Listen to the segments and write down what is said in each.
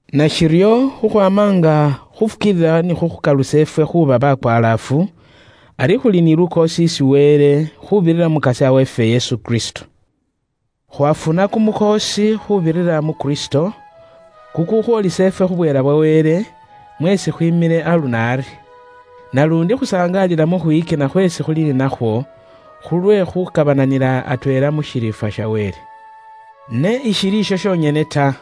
Nashiryo khukhwaama nga khuufukiilila ni khukhukalusa ifwe khuuba bakwalaafu, ari khuli ni lukoosi isi Wele, khuubirira mu Mukasya weefwe Yesu Kristo. Khwaafuna kumukhoosi khuubirira mu Kristo, kukukhwoolisa ifwe khu bweela bwa Wele, mweesi khwiimile aluno ari. Naluundi khusangaalila mu khwiyikina khweesi khuli ni nakhwo, khulwe khukabananila atweela khu shiriifwa sha Wele. Ne ishili isho shonyene ta.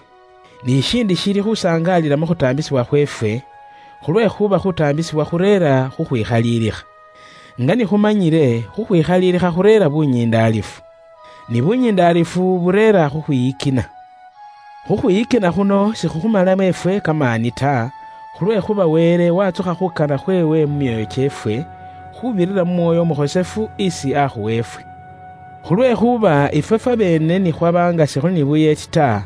Ni shishindi shili khusangaalila mu khutaambisibwa khweefwe, khulwekhuuba khutaambisibwa khureera khukhwikhalilikha. Nga ni khumanyile, khukhwikhalilikha khureera bunyindaalifu. Ni bunyindaalifu bureera khukhwiyikina. Khukhwiyikina khuno sikhukhumalamo ifwe kamaani ta, khulwekhuuba Wele waatsukha khuukana khweewe mu myoyo kyeefwe, khuubirira mu Mwoyo Umukhosefu isi aakhuwa ifwe. Khulwekhuuba ifwe fwabeene ni khwaba nga sikhuli ni buyeeti ta,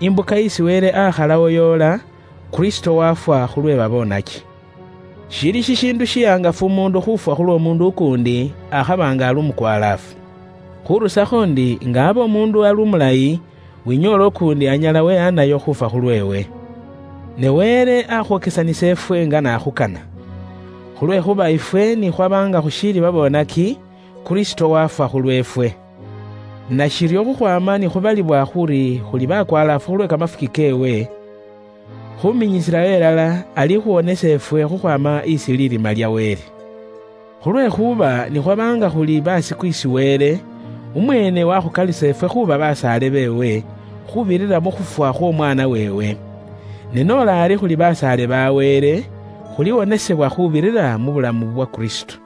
imbuka isi Wele aakhalawo yoola, Kristo waafwa khulwe baboonaki. Shili shishiindu shihangafu umuundu khuufwa khulw'omuundu ukuundi, akhaba nga ali umukwalaafu. Khurusakho ndi nga abe umuundu ali umulayi, winyoola ukuundi anyala wehaanayo khuufwa khulweewe. Ne Wele akhwokesanisa ifwe nga n'akhukana. Khulwekhuuba ifwe ni khwaba nga khushiili babonaki, Kristo wafwa khulweefwe. Nashiryo khukhwaama ni khubalibwa khuri khuli bakwalaafu khulwe kamafuki keewe, khuminyisilawo ilala alikhuwonesa ifwe khukhwaama isi lirima lya Wele. Khulwekhuuba ni khwaba nga khuli basiku isi Wele, umweene wakhukalusa ifwe khuuba basaale beewe, khuubirira mu khufwa khw'Omwaana weewe. Ne noola ari khuli basaale ba Wele, khuliwonesebwa khuubirira mu bulamu bwa Kristo.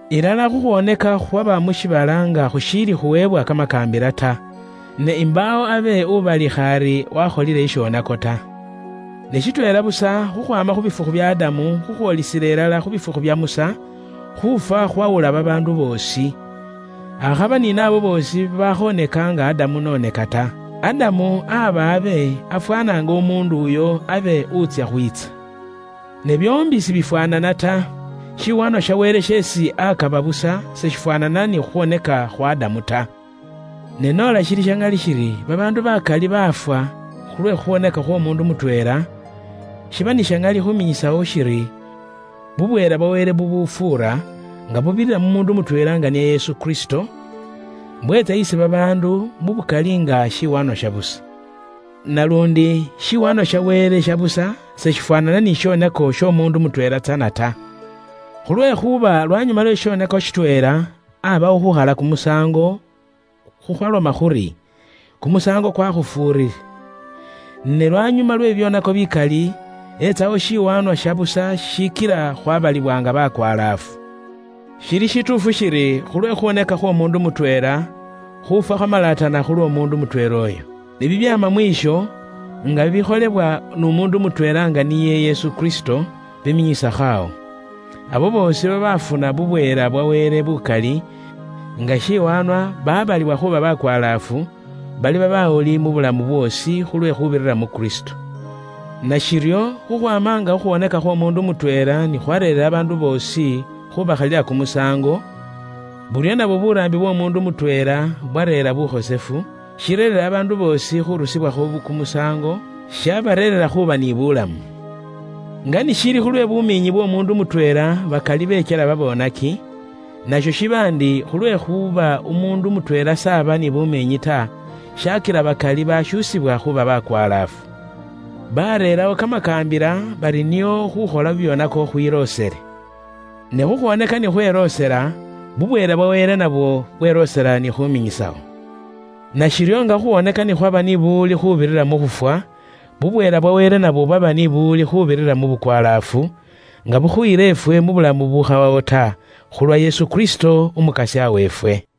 Ilala khukhwooneka khwaba mu shiibala nga khushiili khuweebwa Kamakaambila ta, ne imbaawo abe ubalikha ari wakholile shishonako ta. Ne shitweela busa, khukhwaama khu bifukhu bya Adamu khukhwoolisila ilala khu bifukhu bya Musa, khufwa khwawula babaandu boosi, akhaba ni naabo boosi babaakhonaka nga Adamu n'oneka ta. Adamu aba abe afwaana nga umuundu uyo abe wutsya khwiitsa. Ne byoombi sibifwaanana ta. Shiwaanwa sha Wele sheesi akaba busa seshifwaanana ni khukhwoneka khwa Adamu ta. Ne noola shili sha ŋali shiri babaandu bakali baafwa khulwe khukhwoneka khw'omuundu mutweela, shiba ni sha ŋali khuminyisawo shiri bubweela bwa Wele bubufuura, nga bubirira mu muundu mutweela nga niye Yesu Kristo, bweetsa isi babaandu mu bukali nga shiwaanwa sha busa. Naluundi, shiwaanwa sha Wele sha busa seshifwaanana ni shishonako sh'omuundu mutweela tsana ta. Khulwekhuuba lwanyuma lwe shishonako shitweela, abawo khukhala kumusaango, khukhwaloma khuri, “Kumusaango kwakhufuurire.” Ne lwanyuma lwe bibyoonako bikali, etsawo shiwaanwa sha busa shishikila khwabalibwa nga bakwalaafu. Shili shituufu shili khulwe khukhwoneka khw'omuundu mutweela, khuufwa khwaamalatana khulw'omuundu mutweela uyo. Ne bibyaama mwisho, nga bikholebwa n'umuundu mutweela nga niye Yesu Kristo, biminyisakho awo. Abo boosi babaafuna bubweela bwa Wele bukali nga shiwaanwa baabalibwa khuuba bakwalaafu, baliba bawuli mu bulamu bwoosi khulwe khuubirira mu Kristo. Nashiryo khukhwaama nga khukhwoneka khw'omuundu mutweela ni khwareerera babaandu boosi khubakhalila kumusaango, buryo nabwo buraambi bw'omuundu mutweela bwareera bukhosefu, shireerera babaandu boosi khurusibwakho kumusaango, shabareerera khuuba ni bulamu. Nga ni shili khulwe bumiinyi bw'omuundu mutweela bakali bekyela babonaki, nasho shiba ndi khulwekhuuba umuundu mutweela s'aba ni bumiinyi ta, shakila bakali bashuusibwa khuuba bakwalaafu. Baareerawo kamakaambila bari nio khukhola bibyoonako khwiloosele. Ne khukhwoneka ni khweloosela, bubweela bwa Wele nabwo bweloosela ni khuminyisawo. Nashiryo nga bye bubwoonaki ni byaba ni kamaani ke buwuli khuubirira mu khufwa, bubweela bwa Wele nabwo bwaba ni buwuli khuubirira mu bukwalaafu, nga bukhuyila ifwe mu bulamu bubukhawawo ta, khulwa Yesu Kristo, Umukasya weefwe.